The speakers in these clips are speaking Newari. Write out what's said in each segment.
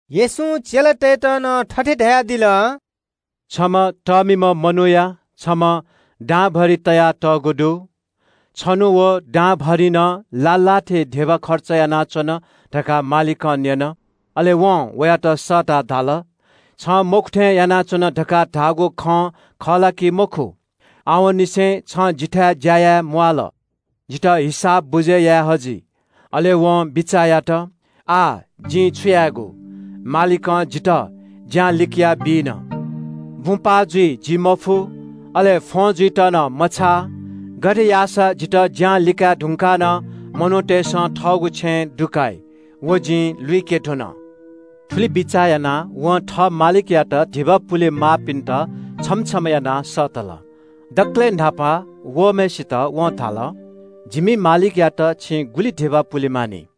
येशूं चेलातय्‌त नं थथे धयादिल – “छम्‍ह तःमिम्‍ह मनूया छम्‍ह दांभरिं तयातःगु दु। छन्‍हु व दांभरिंनं लाः लाः थे धिबा खर्च यानाच्‍वन धकाः मालिकं न्‍यन। अले वं वयात सःताः धाल – ‘छं मखु थें यानाच्‍वन धकाः धाःगु खँ खः ला कि मखु? आवंनिसें छं जिथाय् ज्‍या याये म्‍वाःल। जितः हिसाब बुझय् याये हजि।’ “अले वं बिचाः यात – ‘आः जिं छु यायेगु? मालिकं जितः ज्‍यां लिकयाबी न। बुँ पाः जुइ जिं मफु, अले फ्‍वं जुइत मछाः। गथे याःसा जितः ज्‍यां लिकाये धुंकाः नं मनूतय्‌सं थःगु छेँय् दुकाइ, व जिं लुइके धुन।’ “थुलि बिचाः यानाः वं थः मालिकयात धिबा पुलेमाःपिन्‍त छम्‍ह छम्‍ह यानाः सःतल। दकलय् न्‍हापा वःम्‍हय्‌सित वं धाल – ‘जिमि मालिकयात छिं गुलि धिबा पुले मानि?’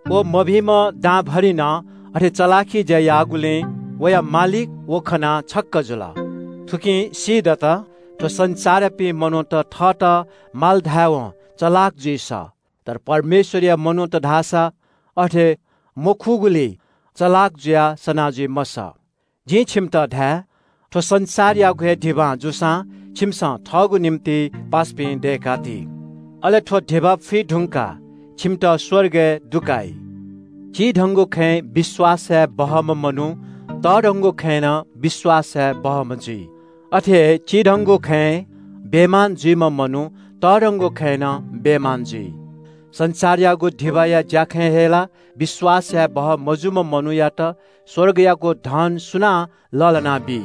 “व मभिंम्‍ह दांभरिंनं अथे चलाखि ज्‍या याःगुलिं वया मालिकं वयागु तारिफ यात। थुकिं सीदत, थ्‍व संसारयापिं मनूत थःत माल धायेवं चलाख जुइ सः, तर परमेश्‍वरया मनूत धाःसा अथे मखुगुलिइ चलाख जुयाः सना जुइ मसः। जिं छिमित धाये – थ्‍व संसारयागु हे धिबां जूसां छिमिसं थःगु निंतिं पासापिं दय्‌का ति। अले थ्‍व धिबा फुइ धुंकाः छिमित स्‍वर्गय् दुकाइ।” “चिधंगु खँय् विश्‍वास याये बहःम्‍ह मनू तःधंगु खँय् नं विश्‍वास याये बहःम्‍ह जुइ। अथे हे चिधंगु खँय् बेइमान जुइम्‍ह मनू तःधंगु खँय् नं बेइमान जुइ। संसारयागु धिबाया ज्‍याखँय् हे ला विश्‍वास यायेबहः मजूम्‍ह मनूयात स्‍वर्गयागु धन सुनां लःल्‍हानाबी।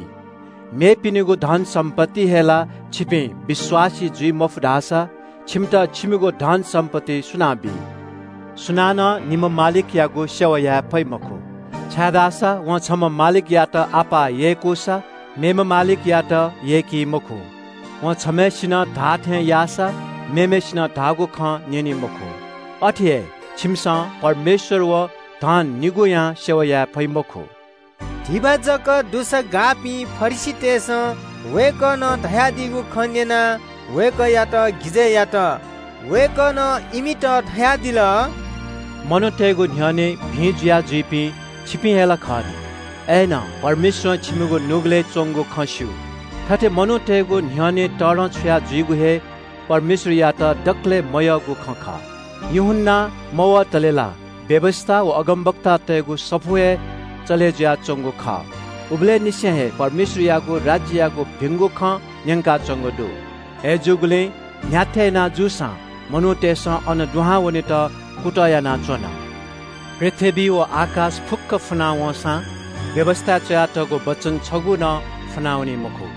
मेपिनिगु धनसम्‍पत्तिइ हे ला छिपिं विश्‍वासी जुइ मफु धाःसा छिमित दयेमाःगु धनसम्‍पत्ति सुनां बी?” “सुं च्‍यलं निम्‍ह मालिकयागु सेवा याये फइ मखु, छाय्‌धाःसा वं छम्‍ह मालिकयात अप्‍वः यय्‌कूसा, मेम्‍ह मालिकयात यय्‌की मखु। वं छम्‍हय्‌सिनं धाःथें याःसा, मेम्‍हय्‌सिनं धाःगु खँ न्‍यनी मखु। अथे हे छिमिसं परमेश्‍वर व धन निगूयां सेवा याये फइ मखु।” धिबा जक दुसा गाःपिं फरिसीतय्‌सं वय्‌कलं धयादीगु खँ न्‍यनाः वय्‌कःयात गिजय् यात। वय्‌कलं इमित धयादिल – “मनूतय्‌गु न्‍ह्यःने भिं जुया जुइपिं छिकपिं हे ला खः नि। अय्‌नं परमेश्‍वरं छिकपिनिगु नुगलय् च्‍वंगु खँ स्‍यू, थथे मनूतय्‌गु न्‍ह्यःने तःधंछुया जुइगु हे परमेश्‍वरयात दकलय् मयःगु खँ खः। “यूहन्‍ना मवतले ला व्‍यवस्‍था व अगमवक्तातय्‌गु सफू हे चले जुयाच्‍वंगु खः। उबलय्‌ निसें हे परमेश्‍वरयागु राज्‍ययागु भिंगु खँ न्‍यंकाच्‍वंगु दु। अय्‌जूगुलिं न्‍ह्याथे याना जूसां मनूतय्‌सं अन दुहां वनेत कुतः यानाच्‍वन। पृथ्‍वी व आकाश फुक्‍क फुना वंसां व्‍यवस्‍थाय् च्‍वयातःगु वचन छगू नं फुनावनी मखु।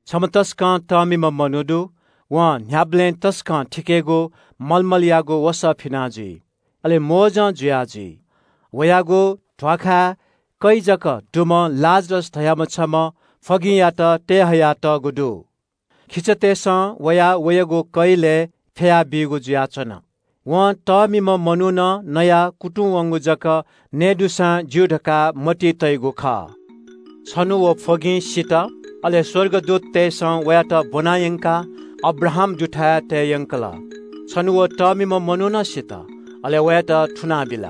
“छम्‍ह तसकं तःमिम्‍ह मनू दु। वं न्‍ह्याबलें तसकं थिकेगु मलमलयागु वसः फिना जुइ। अले मोजं जुया जुइ। वयागु ध्‍वाखाय् कै जक दुम्‍ह लाजरस धाःम्‍ह छम्‍ह फ्‍वगिंयात तयेहया तःगु दु। खिचातय्‌सं वयाः वयागु कैलय् फ्‍यया बीगु जुयाच्‍वन। वं तःमिम्‍ह मनुखं नयाः कुतुं वंगु जक नये दुसां ज्‍यू धकाः मतिइ तइगु खः। “छन्‍हु व फ्‍वगिं सित, अले स्‍वर्गदूततय्‌सं वयात ब्‍वना यंकाः अब्राहाम दुथाय् तये यंकल। छन्‍हु व तःमिम्‍ह मनू नं सित, अले वयात थुनाबिल।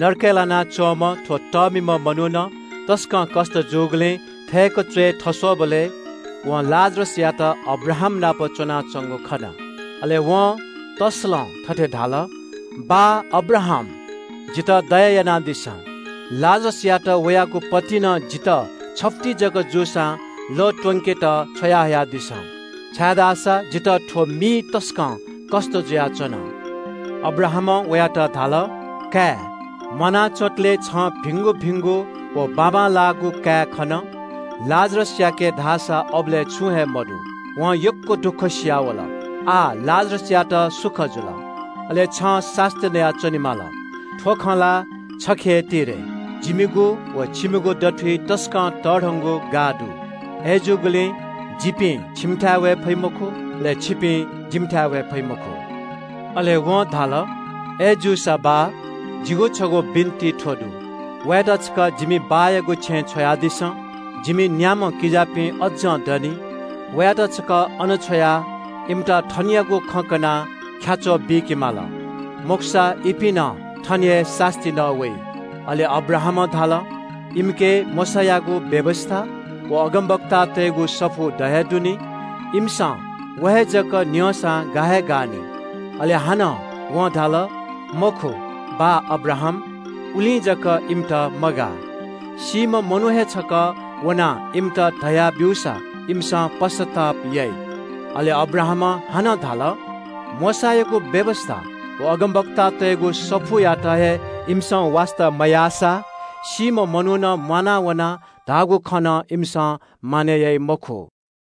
नरकय् लानाच्‍वंम्‍ह थ्‍व तःमिम्‍ह मनुखं तसकं कष्‍ट जूगुलिं च्‍वय् थस्‍वःबलय् तापाकं वं लाजरसयात अब्राहामनाप च्‍वनाच्‍वंगु खन। “अले वं तस्‍सलं थथे धाल – ‘बाः अब्राहाम, जितः दया यानादिसँ। लाजरसयात वयागु पतिनं जितः छफुति जक जूसां लः त्‍वंकेत छ्वयाहयादिसँ, छाय्‌धाःसा जितः थ्‍व मिइ तसकं कष्‍ट जुयाच्‍वन।’ “अब्राहामं वयात धाल – ‘काय्, म्‍वाना च्‍वंतले छं भिंगु भिंगु व बाबांलाःगु काये खन, लाजरसयाके धाःसा अबलय् छुं हे मदु, वं यक्‍व दुःखसिया वल। आः लाजरसयात सुख जुल, अले छं सास्‍ती नया च्‍वनेमाली। थ्‍व खँ ला छखे हे ति रे, जिमिगु व छिमिगु दथुइ तसकं तःधंगु गाः दु, अय्‌जूगुलिं जिपिं छिमिथाय् वये फइ मखु, अले छिपिं जिमिथाय् वये फइ मखु।’ “अले वं धाल – ‘अय्‌जूसा बाः, जिगु छगू बिन्‍ति थ्‍व दु – वयात छकः जिमि बाःयागु छेँय् छ्वयादिसँ। जिमि न्‍याम्‍ह किजापिं अज्‍जं दनि, वयात छकः अन छ्वयाः इमित थनयागु खँ कनाः ख्‍याच्‍वः बीके माल, मखुसा इपिं नं थन हे सास्‍ती नः वइ।’ “अले अब्राहामं धाल – ‘इमिके मोशायागु व्‍यवस्‍था व अगमवक्तातय्‌गु सफू द हे दु नि, इमिसं व हे जक न्‍यंसां गा हे गानि।’ अले हानं वं धाल – ‘मखु, बाः अब्राहाम, उलिं जक इमित मगाः। सीम्‍ह मनू हे छकः वनाः इमित धया ब्‍यूसा इमिसं पश्‍चाताप याइ।’ अले अब्राहामं हानं धाल – ‘मोशायागु व्‍यवस्‍था व अगमवक्तातय्‌गु सफूयात हे इमिसं वास्‍ता मयाःसा सीम्‍ह मनुखं म्‍वाना वनाः धाःगु खँ नं इमिसं विश्‍वास याइ मखु।’”